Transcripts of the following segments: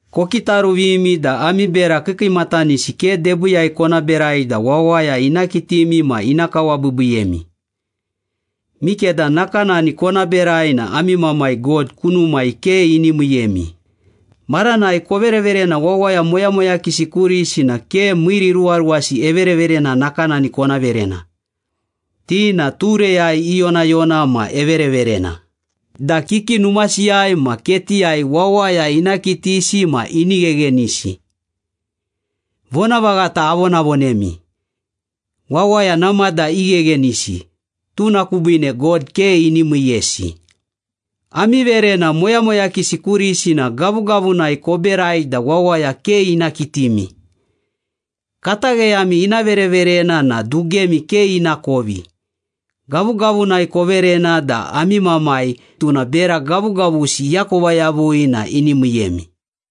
“Kokitaruvimi da ami bera kiikiimatanisi ke debiiyai kona berai da wawaya ina kitimi ma ina kawabiibiiyemi. Mikeda nakanani kona berai na ami Mamai God kunumai ke ini miiyemi.” “Maranai kovereverena wawaya moyamoyakisi kurisi na ke miiriruwaruwasi evereverena nakanani kona verena. Ti na tureyai iyonayona ma evereverena da kiki numasiyai ma ketiyai wawaya ina kitisi ma ini gheghenisi. Vonavaghata avonavonemi, wawaya namada igheghenisi, tuna kubiine God ke ini miiyesi. Ami verena moyamoyakisi kurisi na gavugavunai koberai da wawaya ke ina kitimi. Katagheyami ina vereverena na dugemi ke inakovi. Gavugavunai koverena da ami Mamai, tuna bera gavugavusi iakova yavui na ini miiyemi.”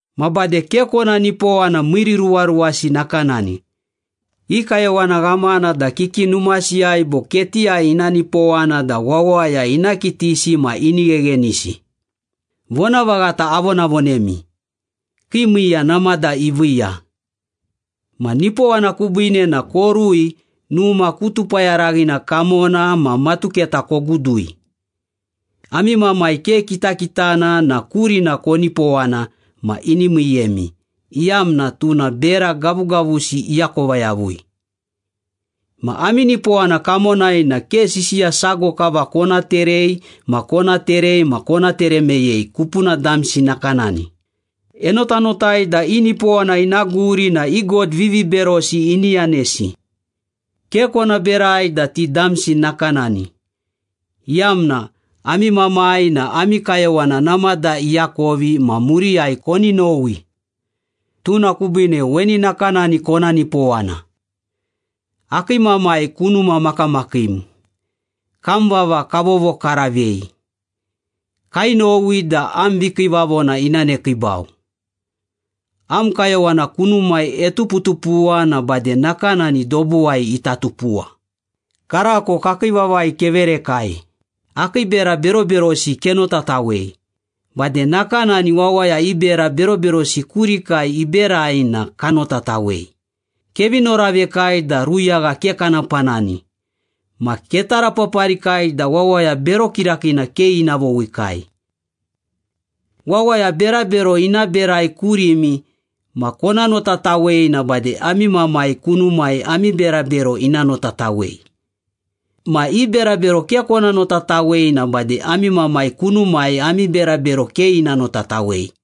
“Ma bade ke kona nipowana miiriruwaruwasi nakanani. I kayowana ghamana da kiki numasiyai bo ketiyai ina nipowana da wawaya ina kitisi ma ini gheghenisi. Vonavaghata avonavonemi, kii miiya namada iviiya. Ma nipowana kubiine na korui numa ku tupayaraghina kamona ma matuketa kogudui. Ami Mamai ke kitakitana na kurina konipowana ma ini miiyemi, iyamna tuna bera gavugavusi iakova yavui.” “Ma ami nipowana kamonai na ke sisiya sago kava kona terei ma kona terei ma kona tere meyei kupuna damsi nakanani. Enotanotai da i nipowana ina guri na i god viviberosi ini yanesi. Ke kona berai da ti damsi nakanani, iyamna ami Mamai na ami kayowana namada iakovi ma muriyai koni nowi. Tuna kubiine weni nakanani kona nipowana. ‘Akii Mamai kunuma makamakiim, Kam vava kavovokaravei. Kainowi da am vikiivavona ina nekiibau. Am kayowana kunumai etuputupuwa na bade nakanani dobuwai ita tupuwa. Karako kakii vavai keverekai. Akii bera beroberosi kenotatawei. Bade nakanani wawaya i bera beroberosi kurikai iberai na kanotatawei. Kevi noravekai da ruyagha ke kana panani. Ma ketarapaparikai da wawaya bero kirakiina ke ina vowikai.’” “Wawaya berabero ina berai kurimi ma kona notatawei na bade ami Mamai kunumai ami berabero ina notatawei. Ma i berabero ke kona notatawei na bade ami Mamai kunumai ami berabero ke ina notatawei.”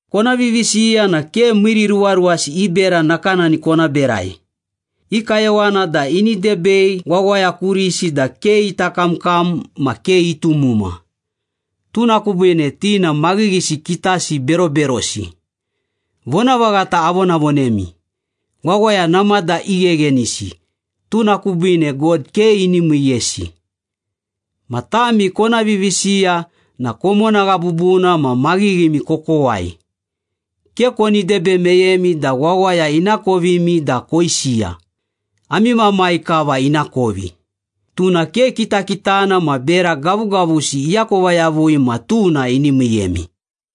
“Kona vivisiya na ke miiriruwaruwasi i bera nakanani kona berai. I kayowana da ini debei wawaya kurisi da ke ita kamkam ma ke itumuma. Tuna kubiine ti na maghighisi kitasi beroberosi. Vonavaghata avonavonemi, wawaya namada igheghenisi, tuna kubiine God ke ini miiyesi. Ma tami kona vivisiya na komonagha bubuna ma maghighimi kokowai. Ke koni debe meyemi da wawaya inakovimi da koisiya. Ami Mamai kava inakovi. Tuna ke kitakitana ma bera gavugavusi iakova yavui ma tuna ini miiyemi.”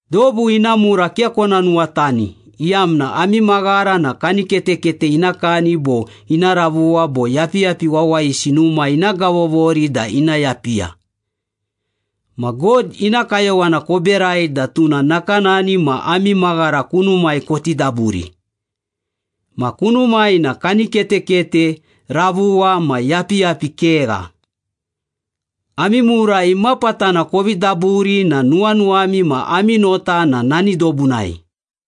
“Dobu ina mura ke kona nuwatani, iyamna ami maghara na kaniketekete ina kani bo ina ravuwa bo yapiyapi wawayisi numa ina gavovori da ina yapiya. Ma God ina kayowana koberai da tuna nakanani ma ami maghara kunumai koti daburi. Ma kunumai na kaniketekete, ravuwa, ma yapiyapi kegha. Ami mura imapatana kovi daburi na nuwanuwami ma ami nota na nani dobunai.”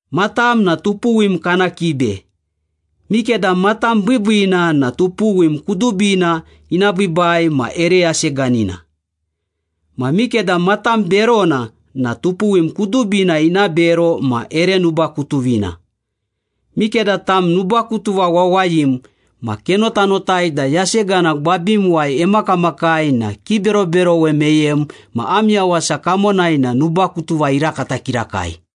“Matam na tupuwim kana kibe. Mikeda matam biibiina na tupuwim kudubina ina biibai ma ere yaseganina. Ma mikeda matam berona na tupuwim kudubina ina bero ma ere nubakutuvina. Mikeda tam nubakutuva wawayim ma kenotanotai da yasegana gwabimuwai emakamakai na kiberoberowe meyem ma am yawasa kamonai na nubakutuva irakata kirakai.”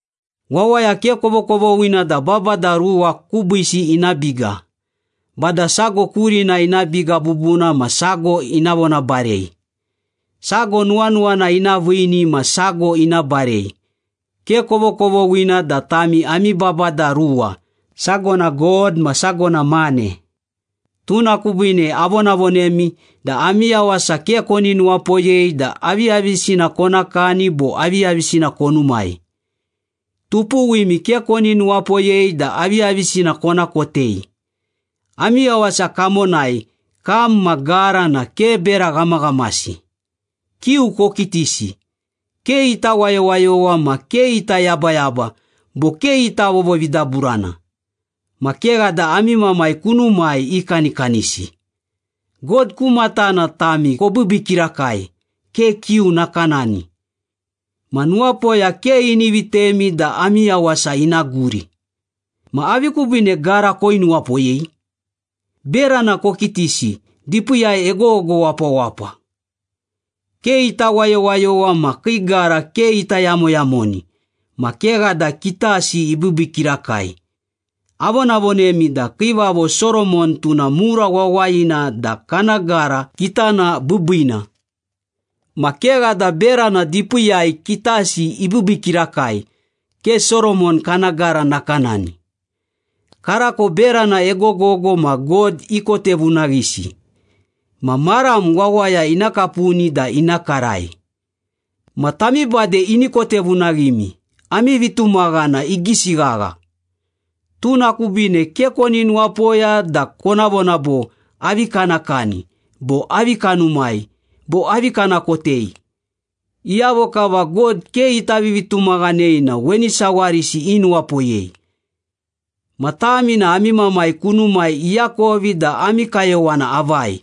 “Wawaya ke kovokovoghina da babada ruwa kubiisi ina biga. Bada sago kurina ina biga bubuna ma sago ina vonabarei. Sago nuwanuwana ina viini ma sago ina barei. Ke kovokovoghina da tami ami babada ruwa, sago na God ma sago na mane.” “Tuna kubiine avonavonemi da ami yawasa ke koni nuwapoyei da aviyavisina kona kani bo aviyavisina konumai. Tupuwimi ke koni nuwapoyei da aviyavisina kona kotei. Ami yawasa kamonai, kam ma gara na ke bera ghamaghamasi. Kiu kokitisi, ke ita wayowayowa ma ke ita yabayaba bo ke ita vovovidaburana. Ma kegha da ami Mamai kunumai ikanikanisi. God ku matana tami kobiibii kirakai, ke kiu nakanani. Ma nuwapoya ke ini vitemi da ami yawasa ina guri.” “Ma avi kubiine gara koinuwapoyei? Berana kokitisi, dipiiyai egogogo wapawapa. Ke ita wayowayowa ma kii gara ke ita yamoyamoni. Ma kegha da kitasi ibiibii kirakai. Avonavonemi da Kiivavo Soromon tuna mura wawayina da kana gara kitana biibiina. Ma kegha da berana dipiiyai kitasi ibiibii kirakai, ke Soromon kana gara nakanani. Karako berana egogogo ma God ikotevunaghisi. Ma maram wawaya ina kapuni da ina karai. Ma tami bade ini kotevunaghimi. Ami vitumaghana igisi ghagha!” “Tuna kubiine ke koni nuwapoya da kona vona bo, ‘Avi kana kani?’ bo ‘Avi kanumai?’ bo ‘Avi kana kotei?’ Iyavo kava God ke ita vivitumaghanei na weni sawarisi inuwapoyei. Ma tami na ami Mamai kunumai iakovi da ami kayowana avai.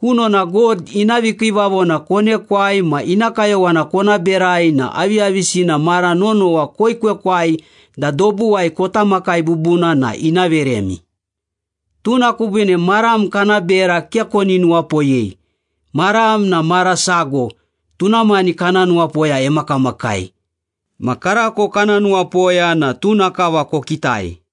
Kunona God ina vikiivavona konekwai ma ina kayowana kona berai na aviyavisina mara nonowa koekwekwai da dobuwai kota makai bubuna na ina veremi. Tuna kubiine maram kana bera ke koni nuwapoyei. Maram na mara sago, tuna mani kana nuwapoya emakamakai. Ma karako kana nuwapoya na tuna kava kokitai.”